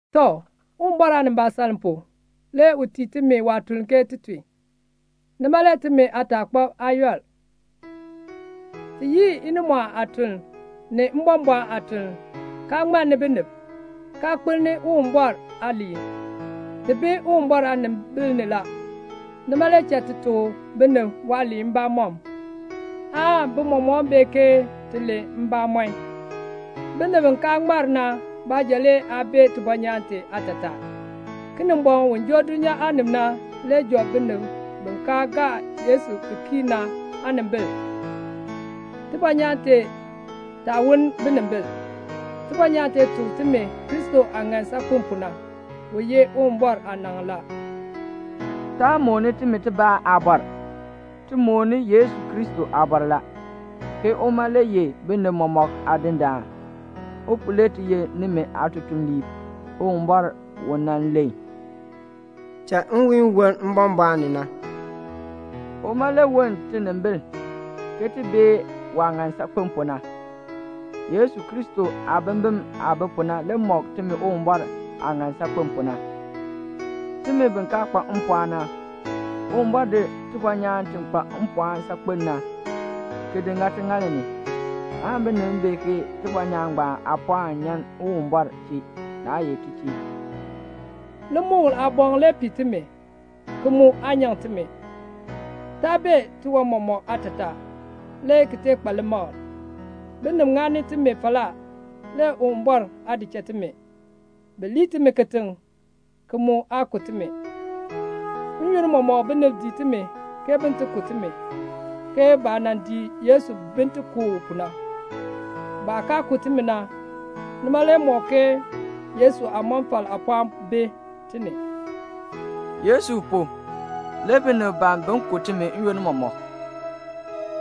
Tɔ, Uwumbɔr aanimbaasaln pu, le u tii timi waatuln ke ti tun. Nima le timi aataakpab aa yɔl. Ti yii inimɔɔn aatuln, ni mbɔmbɔɔn aatuln, kaa ŋmanni binib, kaa kpalni Uwumbɔr aaliin. Ti bi Uwumbɔr aanimbil ni la. Nima le cha ti tuk binib waaliin mbamɔm, aan bi mɔmɔk bee ke ti len mbamɔn. Binib bi kaa ŋmar na baanja le aa bee tibɔnyaan tee aatataa. Kinimbɔŋ, u joo dulnyaa aanib na le job binib bi kaa gaa Yesu ki kii na aanimbil, tibɔnyaan tee taa woln binimbil. Tibɔnyaan tee tuk timi Kristo aah ŋan saakpen pu na. U ye Uwumbɔr aanaŋ la. Taa mooni timi tibaa aabɔr. Ti mooni Yesu Kristo aabɔr la, ke uma le ye binib mɔmɔk Aadindaan. U pu le ti ye nimi aatutuliib. Uwumbɔr u nan len "Cha nwiihn woln mbɔmbɔɔn ni na," uma le woln tinimbil, ke ti bee waah ŋan saakpen pu na. Yesu Kristo aabimbin aah bi pu na le mɔk timi Uwumbɔr aah ŋan saakpen pu na. Timi bi kaa kpa mpɔɔn na, Uwumbɔr di tibɔnyaan ti kpa mpɔɔn saakpen na, ki di ŋa tiŋaal ni, aan binib bee ke tibɔnyaan ngbaan aapɔɔn nyan Uwumbɔr chee, naa ye ti chee. Limukl aaboŋ le pii timi, ki mu aa nyaŋ timi. Taa bee tiwan mɔmɔk aatataa, le ki tee kpa limakl. Binib ŋani timi falaa, le Uwumbɔr aa di cha timi. Bi lir timi kitiŋ, ki mu aa ku timi. N-yoonn mɔmɔk binib dii timi ke bin ti ku timi, ke baah nan dii Yesu bin ti ku u pu na. Baah kaa ku timi na, nima le mɔk ke Yesu aamɔfal aapɔɔn bi ti ni. Yesu pu le binib ban bin ku timi n-yoonn mɔmɔk.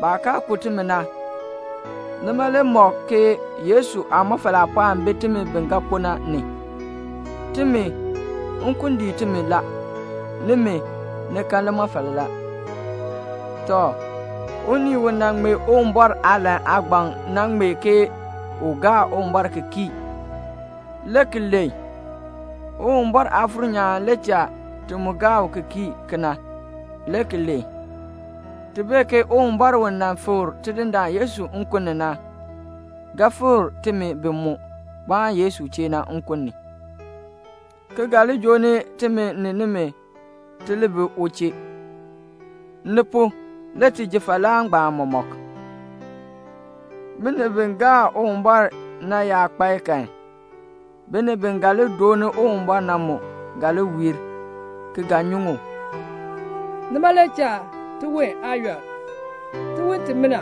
Baah kaa ku timi na, nima le mɔk ke Yesu aamɔfal aapɔɔn bi timi bi ga kpo na ni. Timi, nkun dii timi la. Nimi, ni kan limɔfal la. Tɔ, unii u nan ŋmee Uwumbɔr aalahn aagbaŋ na ŋmee ke u gaa Uwumbɔr ki kii, le ki len. Uwumbɔr Aafuur nyaan le cha ti mu gaa u ki kii kena, le ki len. Ti bee ke Uwumbɔr u nan fikr Tidindaan Yesu nkun ni na, ga fikr timi bi mu kpaan Yesu chee na nkun ni, ki ga li joo ni timi ni nimi, ti li bi u chee. Ni pu, le ti ji falaa ngbaan mɔmɔk. Binib bi gaa Uwumbɔr na yaa kpae kan, binib bi ga li dooni Uwumbɔr na mu ga li wiir, ki ga nyuŋ u. Nima le cha tiwon aa yɔl. Tiwon timina,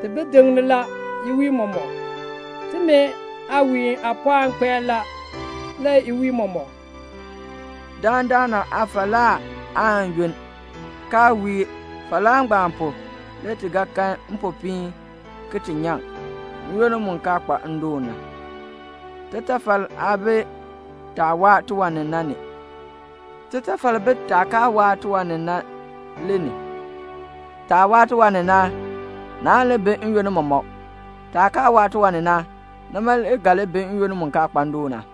ti bi diŋni la iwiin mɔmɔk. Timi aawiin aapɔɔn kpae la, le iwiin mɔmɔk. Dandana aafalaa aan yunn, kaa wiir. Falaa ngbaan pu, le ti ga kan mpopiin ki ti nyaŋ, n-yoonn mu kaa kpa ndoon na. Titafal aa bi taah waa tiwan ni na ni, titafal bi taah kaa waa tiwan ni na le ni. Taah waa tiwan ni na, naan li bi n-yoonn mɔmɔk. Taah kaa waa tiwan ni na, nima le ga li bi n-yoonn mu kaa kpa ndoon na.